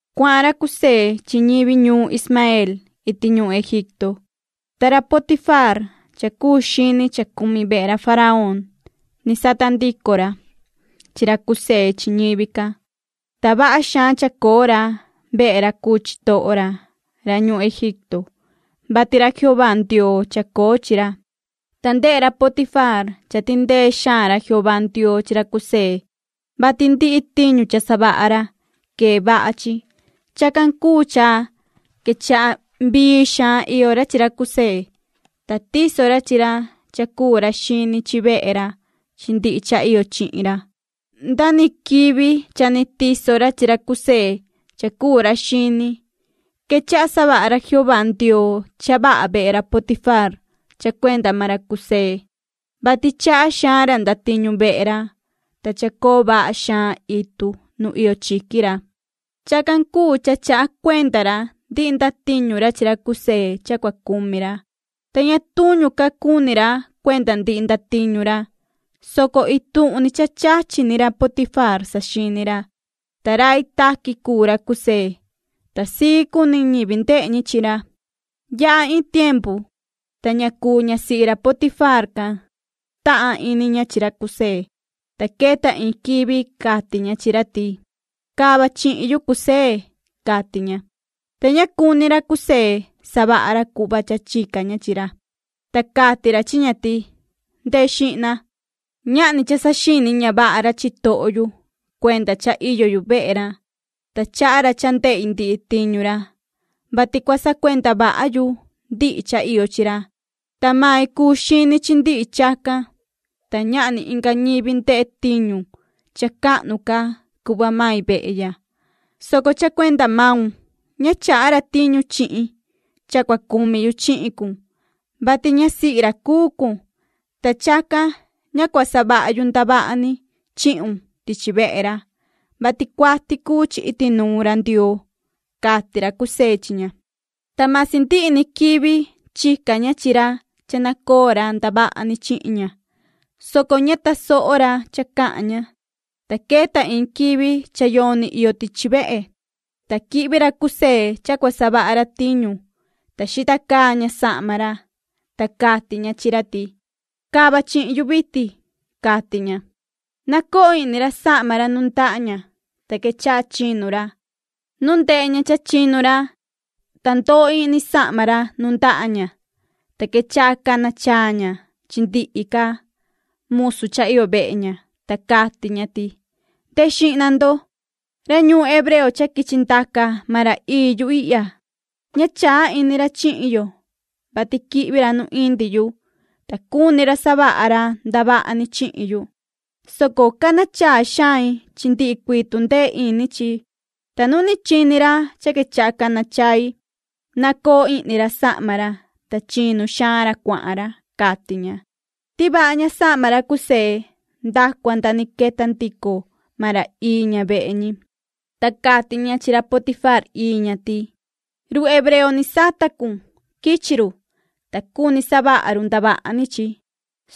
Cuahan ra José chi ñivi ñuun Ismaeel iti ñuhun Egipto, ta ra Potifaar cha cuu xini cha cumi vehe ra faraón, ni sata ndico ra, chi ra José chi ñivi can. Ta vaha xaan chacoo ra vehe ra cuu chitoho ra, ra ñuhun Egipto, vati ra Jehová Ndioo chacoo chi ra. Ta ndehe ra Potifaar cha tindee xaan ra Jehová Ndioo chi ra José, vati ndihi tiñu cha ndacu ra quee vaha chi. Chacan cuu cha quechaha vii xaan iyo ra chi ra José, ta tiso ra chi ra cha cuu ra xini chi vehe ra chi ndihi cha iyo chihin ra. Nda ni quivi cha ni tiso ra chi ra José cha cuu ra xini, quechaha savaha ra Jehová Ndioo cha vaha vehe ra Potifaar cha cuenda maan ra José, vati chaha xaan ra ndatiñu vehe ra, ta chacoo vaha xaan itu nu iyo chiqui ra. Chacan cuu cha chaha cuenda ra ndihi ndatiñu ra chi ra José cha cua cumi ra, ta ña tuñu ca cuni ra cuenda ndihi ndatiñu ra, soco ituhun ni cha chachi ni ra Potifaar saxini ra. Ta rai taqui cuu ra José, ta sii cuni ñivi ndehe ñi chi ra. Yaha iin tiempu, ta ña cuu ñasihi ra Potifaar can, tahan ini ña chi ra José, ta queta iin quivi cati ña chi ra ti: ―Cava chihin yu, José ―cati ña. Ta ña cuni ra José savaha ra cuhva cha chica ña chi ra, ta cati ra chi ña ti: ―Ndehe xihna, ñahni cha saxini ña vaha ra chitoho yu, cuenda cha iyo yu vehe ra, ta chaha ra cha ndehi ndihi tiñu ra, vati cua sacuenda vaha yu ndihi cha iyo chi ra. Ta mai cuu xini chi ndihi chacan, ta ñahni inga ñivi ndehe tiñu cha cahnu ca cuhva mai vehe ya, soco cha cuenda maun ña chaha ra tiñu chihin cha cua cumi yu chihin cun, vati ñasihi ra cuu cun, ta chacan ña cua savaha yu ndavaha ni chihun tichi vehe ra, vati cuati cuu chi iti nuun ra Ndioo ―cati ra José chi ña. Ta masi ndihi ni quivi chica ña chi ra cha nacoo ra ndavaha ni chihin ña, soco ña tasoho ra cha cahan ña. Ta queta iin quivi cha yoni iyo tichi vehe, ta quihvi ra José cha cua savaha ra tiñu, ta xita caa ña sahma ra, ta cati ña chi ra ti: ―Cava chihin yu vitin ―cati ña. Nacoo ihni ra sahma ra nuun ndaha ña, ta quechaha chinu ra. Nu ndehe ña cha chinu ra, ta ndoo ihni sahma ra nuun ndaha ña, ta quechaha cana chaa ña chi ndihi ca musu cha iyo vehe ña, ta cati ña ti: ―Ndehe xihna ndo, ra ñuun hebreo cha quichi ndaca maan ra ii yu ihya, ña chaa ini ra chihin yo, vati quihvi ra nu indi yu, ta cuni ra savaha ra ndavaha ni chihin yu, soco cana chaa xain chi ndihi cuii tundee ini chi. Ta nu ni chini ra cha quechaha cana chai, nacoo ihni ra sahma ra, ta chinu xaan ra cuahan ra ―cati ña. Tivaha ña sahma ra José nda cua nda ni queta ndico maan ra ii ña vehe ñi. Ta cati ña chi ra Potifaar ii ña ti: ―Run hebreo ni sata cun, quichi run, ta cuni savaha run ndavaha ni chi,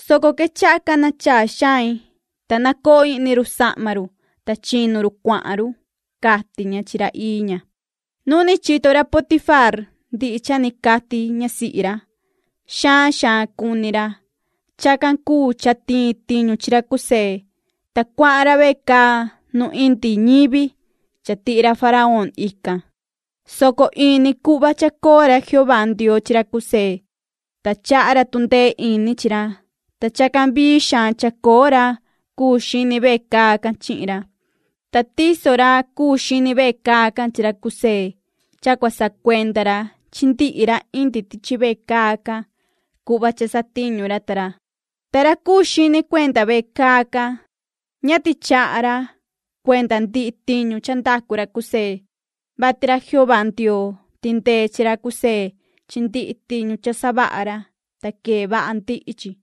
soco quechaha cana chaa xain, ta nacoo ihni run sahma run, ta chinu run cuahan run ―cati ña chi ra ii ña. Nu ni chito ra Potifaar ndihi cha ni cati ñasihi ra, xaan xaan cuni ra. Chacan cuu cha tiin tiñu chi ra José, ta cuahan ra vecaa nu indi ñivi cha tihi ra faraón ican, soco in ni cuhva chacoo ra Jehová Ndioo chi ra José, ta chaha ra tundee ini chi ra, ta chacan vii xaan chacoo ra cuu xini vecaa can chihin ra. Ta tiso ra cuu xini vecaa can chi ra José cha cua sacuenda ra chi ndihi ra indi tichi vecaa can cuhva cha satiñu ra ta ra. Ta ra cuu xini cuenda vecaa can, ña tichaha ra cuenda ndihi tiñu cha ndacu ra José, vati ra Jehová Ndioo tindee chi ra José chi ndihi tiñu cha ndacu ra, ta quee vaha ndihi chi.